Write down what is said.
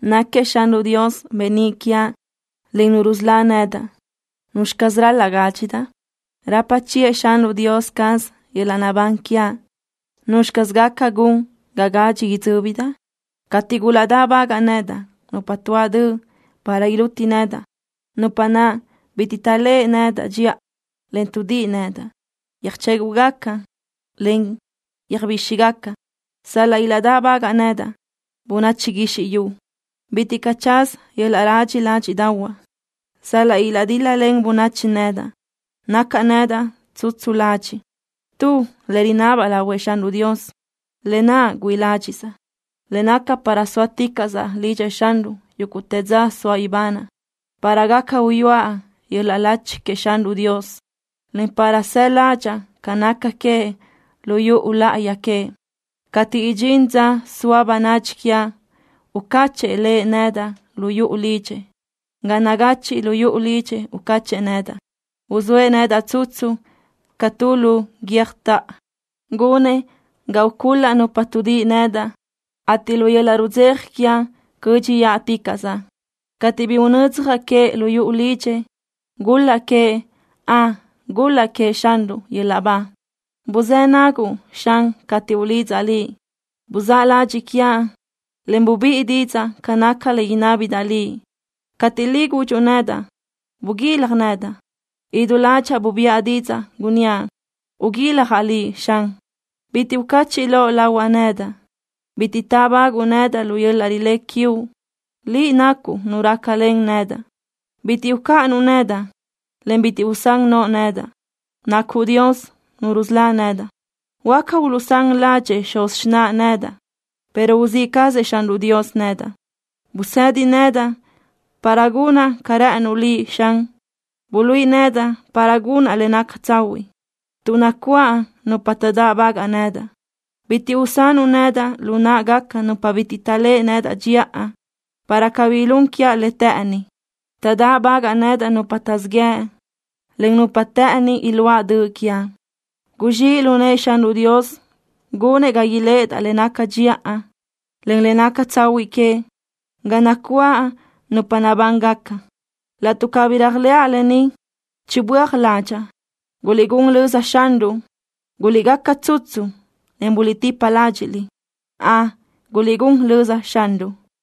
Náquiëʼ Xanruʼ Dios beníʼ quiaʼ, en Nu rusölá nedaʼ. ¿Nuzxi caz ral-laʼ gádxidaʼ? Rapa chiʼë Xanruʼ Dios caz yöl-laʼ naʼbán quiaʼ. ¿Nuzxi caz gaca gun ga gadxi idzö́bidaʼ? Cateʼ gulaʼdáʼbagaʼ nedaʼ nupa tuáʼ döʼ para iluti nedaʼ, nupa naʼ bitiʼ taʼléʼe nedaʼ dxiʼa, en tuʼdíʼi nedaʼ, yöjchéguʼgaca, en yöjbíxigaca. Sal-laʼ ilaʼdáʼbagaʼ nedaʼ bönachi guizxi yu, bitiʼ caʼ tsaza yöl-laʼ radxi ládxiʼdaʼahuaʼ. Sal-laʼ ilaʼdíl-lalen bönachi nedaʼ, nacaʼ nedaʼ tsutsu ladxiʼ. Tu le rinabaʼ lahuëʼ Xanruʼ Dios, lë naʼ güíʼi ládxiʼsaʼ, le naca para sóaticaʼsaʼ lidxëʼ Xanruʼ yúguʼtë dza soaʼ ibanaʼ, para gaca uyúaʼ yöl-laʼ lachi queëʼ Xanruʼ Dios, en para saʼ ládxaʼa ca naca queëʼ lu yuʼu láʼayi queëʼ. Cateʼ idxín dza soa bönadxi quiaʼ, ucáchëʼë Lëʼ nedaʼ lu yuʼu lidxëʼ. Ga nagachiʼ lu yuʼu lidxëʼ ucáchëʼë nedaʼ. Uzóëʼ nedaʼ tsutsu ca tu lu guiö́jtoʼo. Gunëʼ ga ucul-laʼ nupa tuʼdíʼi nedaʼ, ateʼ lu yöl-laʼ rudzeja quiaʼ cö́dxiʼaticaʼsaʼ cateʼ bi unödzjaʼ queëʼ lu yuʼu lidxëʼ. ¡Gul-laʼ queëʼ! ¡Ön, gul-laʼ queëʼ Xanruʼ yöl-laʼ ba! Buzë́ naguʼ, Xan, cateʼ ulidzaʼ Liʼ. Buzáʼ ladxiʼ quiaʼ, en bubíʼi didzaʼ ca naca le inábidaʼ Liʼ. Cateʼ Liʼ gudxuʼ nedaʼ: “Buguilaj nedaʼ”, idú ládxaʼa bubiʼa didzaʼ, gunníaʼ: Uguiljaʼ Liʼ, Xan. Bitiʼ ucachiʼ loʼ lahuaʼ nedaʼ. Bitiʼ taʼbaguʼu nedaʼ lu yöl-laʼ rilé quiuʼ. Liʼ nacuʼ Nu rácalen nedaʼ. Bitiʼ ucáʼanuʼ nedaʼ, en bitiʼ usán noʼo nedaʼ. Nacuʼ Dios, Nu rusölá nedaʼ. Huáca uluʼsán ládxëʼë xuz xináʼa nedaʼ, pero uzíʼ cazëʼ Xanruʼ Dios nedaʼ. Busedi nedaʼ para gunaʼ ca rë́ʼënuʼ Liʼ, Xan. Buluíʼi nedaʼ para gunaʼ le naca tsahuiʼ, tuʼ nacuáʼ nupa taʼdáʼbagaʼ nedaʼ. Bitiʼ usanuʼ nedaʼ lu náʼagaca nupa bitiʼ taʼléʼe nedaʼ dxiʼa para cabí ilún quiaʼ le të́ʼëni. Taʼdáʼbagaʼ nedaʼ nupa taʼzíʼ yëʼ, en nupa të́ʼëni iluáʼ döʼ quiaʼ. Guzxíʼ lu nëʼë Xanruʼ Dios gunëʼ ga iléʼedaʼ le naca dxiʼa, en le naca tsahuiʼ queëʼ ga nacuáʼ nupa nabángaca. Laʼtuʼ cabí réajlëʼa lë ni, chibö́aj ládxaʼa. ¡Guliʼgún lözëʼ Xanruʼ! ¡Guliʼgaca tsutsu, en buliʼtipa ládxiʼliʼ! ¡Ön, guliʼgún lözëʼ Xanruʼ!